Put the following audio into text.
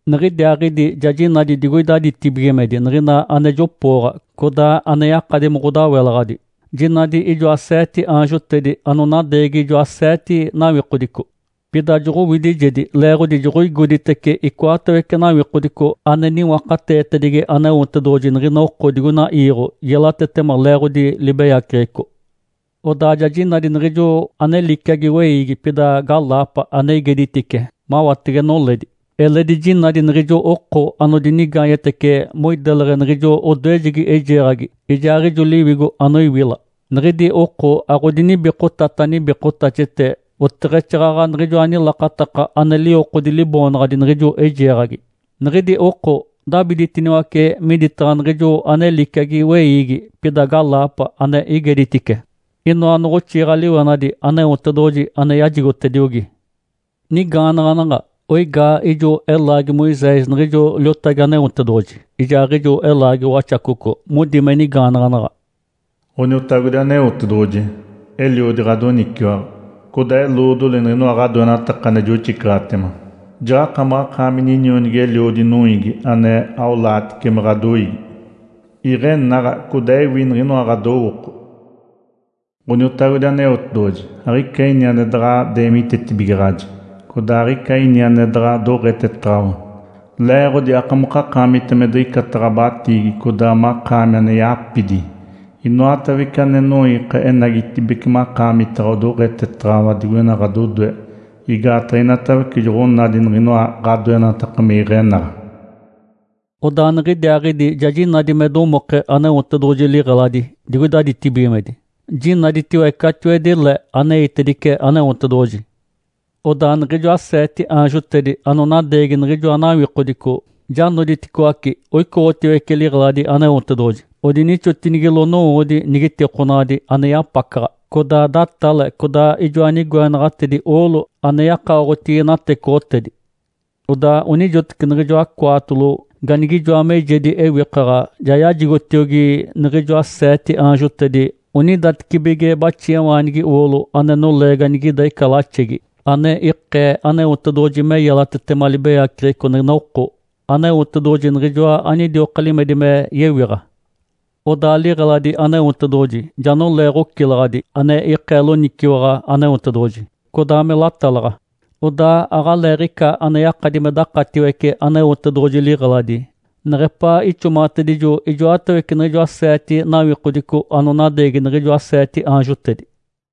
Niɡ̶idiaaɡ̶idi ja jinadi digoida ditibigimedi niɡ̶ina ane jopooɡ̶a codaa ane yakadi me ɡ̶odawelaɡ̶adi. Jinadi ijoa seete aanjotedi anonadeegi ijoa seete nawikodico. Pida joɡ̶owidijedi leeɡ̶odi joɡ̶oigoditece icoatawece nawikodico ane niwakateetedigi Aneotedoɡ̶oji niɡ̶ina oko digoina iiɡ̶o. Yelatetema leeɡ̶odi libeyaceɡ̶eco. Odaa ja jinadi niɡ̶ijo ane liciagi weiigi pida galaapa ane igeditice mawatege noledi. Eledi jinadi niɡ̶ijo oko anodinigaanyetece moideleɡ̶e niɡ̶ijo odoejegi eijeeɡ̶agi ijaaɡ̶ijo liwigo anoiwila. Niɡ̶idi oko aɡ̶odinibikotata nibikotaxete, oteɡ̶exaaɡ̶aɡ̶a niɡ̶ijoa nilakataka ane liwokodi liboonaɡ̶adi niɡ̶ijo eijeeɡ̶agi. Niɡ̶idi oko dabiditiniwace miditaɡ̶a niɡ̶ijo ane liciagi weiigi pida galaapa ane igeditice. Inoa noɡ̶oxiɡ̶a-liwenadi Aneotedoɡ̶oji ane yajigotediogi. Nigaanaɡ̶anaɡ̶a, oigaa ijo elaagi Moisés niɡ̶ijo liotagi Aneotedoɡ̶oji ijaaɡ̶ijo elaagi Waxacoco. Modi me nigaanaɡ̶anaɡ̶a, “Ǥoniotagodi Aneotedoɡ̶oji, eliodi ɡ̶adoniciwaɡ̶a. Codaa eloodoli niɡ̶inoa ɡ̶adoenataka ane joxicaɡ̶atema. Jaɡ̶akamaɡ̶akaami ninionigi-eliodi noiigi ane aolaatice me ɡ̶adoiigi. Iɡ̶enaɡ̶a codaa ewi niɡ̶inoa ɡ̶adowooko. Ǥoniotagodi Aneotedoɡ̶oji, aɡ̶ica ini ane daɡ̶a deemitetibigaɡ̶aji. Codaa aɡ̶ica ini ane daɡ̶a doɡ̶etetaɡ̶awa, leeɡ̶odi akamokakaamita me diɡ̶icata ɡ̶abatiigi codaa makaami ane yapidi. Inoatawece ane noiika enagitibeci makaamitaɡ̶a, odoɡ̶etetaɡ̶awa digoina ɡ̶adodoe. Igaataɡ̶a inatawece joɡ̶onadi niɡ̶inoa ɡ̶adoenataka me iɡ̶enaɡ̶a.” Odaa niɡ̶idiaaɡ̶idi ja jinadi me domoke Aneotedoɡ̶oji liɡ̶eladi digoida ditibigimedi, jinaditiwe catiwedi le, aneitedice Aneotedoɡ̶oji. Odaa niɡ̶ijoa seete aanjotedi anonadeegi niɡ̶ijoa nawikodico ja noditicoaci oicoɡ̶otiwece liɡ̶eladi Aneotedoɡ̶oji. Odinixotinigilo nowoodi nigitikonaɡ̶adi ane yapacaɡ̶a, codaa datale, codaa ijoa nigoenaɡ̶atedi oolo ane yakaoɡ̶otigi natecoɡ̶otedi. Odaa onijoteci niɡ̶ijoa cwaatolo ganigijoa meijedi ewikaɡ̶a ja yajigotiogi niɡ̶ijoa seete aanjotedi onidatecibige baxiawaanigi oolo, ane nolee ganigida ica laxegi, ane ikee Aneotedoɡ̶oji me yelatetema libeyaceɡ̶eco niɡ̶ina oko. Aneotedoɡ̶oji niɡ̶ijoa anidioka limedi me yewiɡ̶a. Odaa liɡ̶eladi Aneotedoɡ̶oji ja nolee ɡ̶ocilaɡ̶adi ane ikee loniciwaɡ̶a Aneotedoɡ̶oji, codaa me latalaɡ̶a. Odaa aɡ̶aleeɡ̶ica ane yakadi me dakatiwece Aneotedoɡ̶oji liɡ̶eladi neɡ̶epaa ixomaɡ̶atedijo ijoatawece niɡ̶ijoa seete nawikodico anonadeegi niɡ̶ijoa seete aanjotedi.